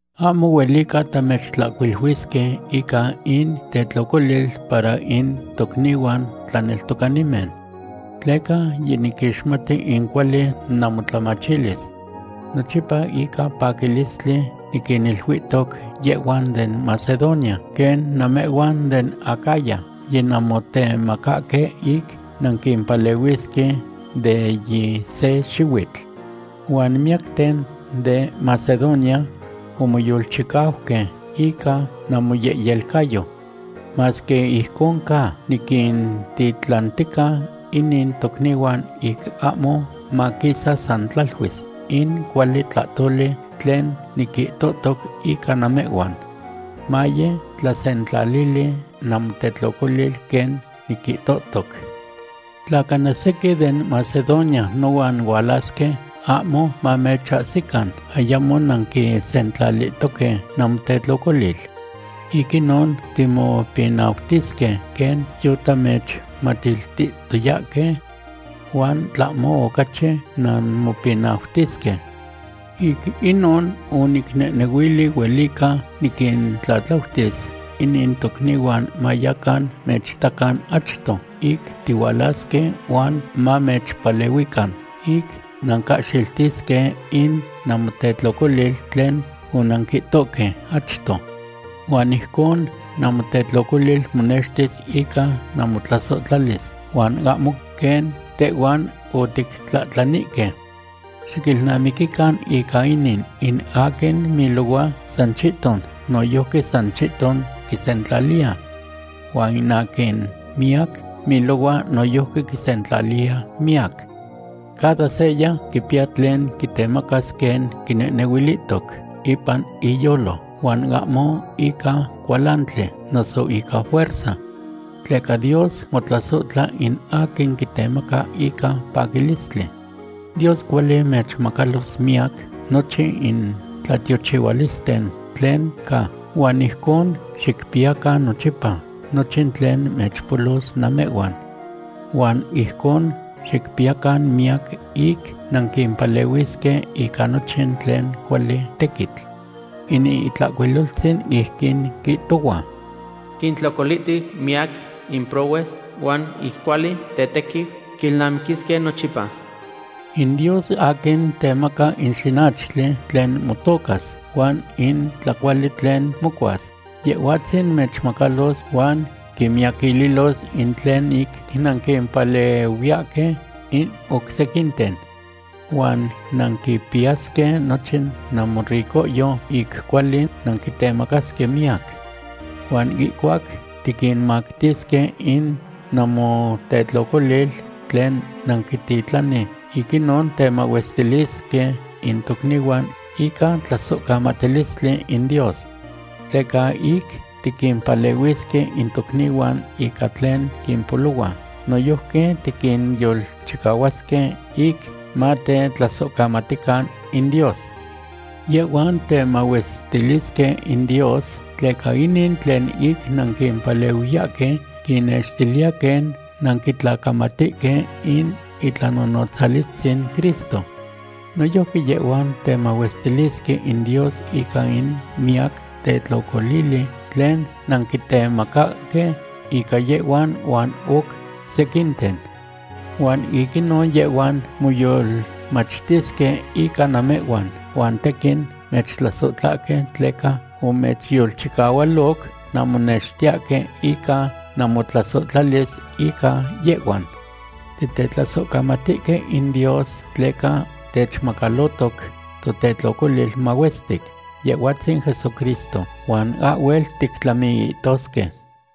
Ahmo huelica tamechtlahcuiluisque ica in tetlocolil para in tocnihuan tlaneltocanimen. Tleca yiniquixmati in cuali namotlamachilis. Nochipa ica paquilistli niquiniluihtoc yehhuan den Macedonia quen namehhuan den Acaya yinanmotemacahque ic nanquimpalehuisque de yi se xihuitl. Huan miyacten de Macedonia omoyolchicauque ica namoyehyelcayo. Masque ijcon ca, niquintitlantica inin tocnihuan ic ahmo maquisa san tlaluis in cuali tlahtoli tlen niquihtohtoc ica namehhuan. Maye tlasentlalili namotetlocolil quen niquihtohtoc. Tla cana sequin den Macedonia nohuan hualasque, ahmo mamechahsican ayamo nanquisentlalihtoque namotetlocolil. Ic inon timopinautisque quen yotamechtemachihtoyahque. Huan tlahmo ocachi nanmopinautisque. Ic inon onicnehnehuili huelica niquintlatlautis inin tocnihuan mayacan mechitacan achto ic tihualasque huan mamechpalehuican ic nancahxiltisque in namotetlocolil tlen onanquihtoque achto. Huan ijcon namotetlocolil monextis ica namotlasohtlalis, huan ahmo quen tehhuan otictlahtlaninihque. Xiquilnamiquican ica inin: In aquin milohua san chihton, noyojqui san chihton quisentlaliya. Huan aquin miyac milohua noyojqui quisentlaliya miyac. Cada seya quipiya tlen quitemacas quen quinehnehuilihtoc ipan iyolo, huan ahmo ica cualantli noso ica fuerza. Tleca Dios motlasohtla in aquin quitemaca ica paquilistli. Dios cuali mechmacalos mimiyac nochin in tlatiochihualisten tlen ca, huan ijconon xicpiyacan nochipa nochin tlen mechpolos namehhuan. Huan ijconon xicpiyacan miyac ic nanquimpalehuisque ica nochin tlen cuali tequitl. In Itlahcuiloltzin ijquin quihtohua: Quintlocolihtiu miyac in prohues, huan in cuali tetequiu quilnamiquisque nochipa. In Dios, aquin temaca in xinachtli tlen motocas huan in tlacuali tlen mocuas, Yehhuatzin mechmacalos huan quimiyaquililos in tlen ic nanquimpalehuiyahque in oc sequinten. Huan nanquipiyasque nochin namoricohyo ic cuali nanquitemacasque miyac. Huan ihcuac tiquinmactisque in namotetlocolil tlen nanquititlani, ic inon temahuestilisque in tocnihuan ica tlasohcamatilistli in Dios. Tleca ic tiquimpalehuisque in tocnihuan ica tlen quimpolohua, noyojqui tiquinyolchicahuahque ic matetlasohcamatican in Dios. Yehhuan temahuestilisque in Dios, tleca inin tlen ic nanquimpalehuiyahque quinnextiliya quen nanquitlacamatihque in itlanonotzalistzin Cristo. Noyojqui yehhuan temahuestilisque in Dios ica in miyac tetlocolili tlen nanquitemacahque ica yehhuan huan oc sequinten. Huan ic inon yehhuan moyolmachtisque ica namehhuan, huan tequin mechtlasohtlahque tleca omechyolchicahualoc nanmonextiyahque ica namotlasohtlalis ica yehhuan. Titetlasohcamatihque in Dios tleca techmacalohtoc totetlocolil mahuestic Yehhuatzin Jesucristo, huan ahhuel tictlamiihtosque.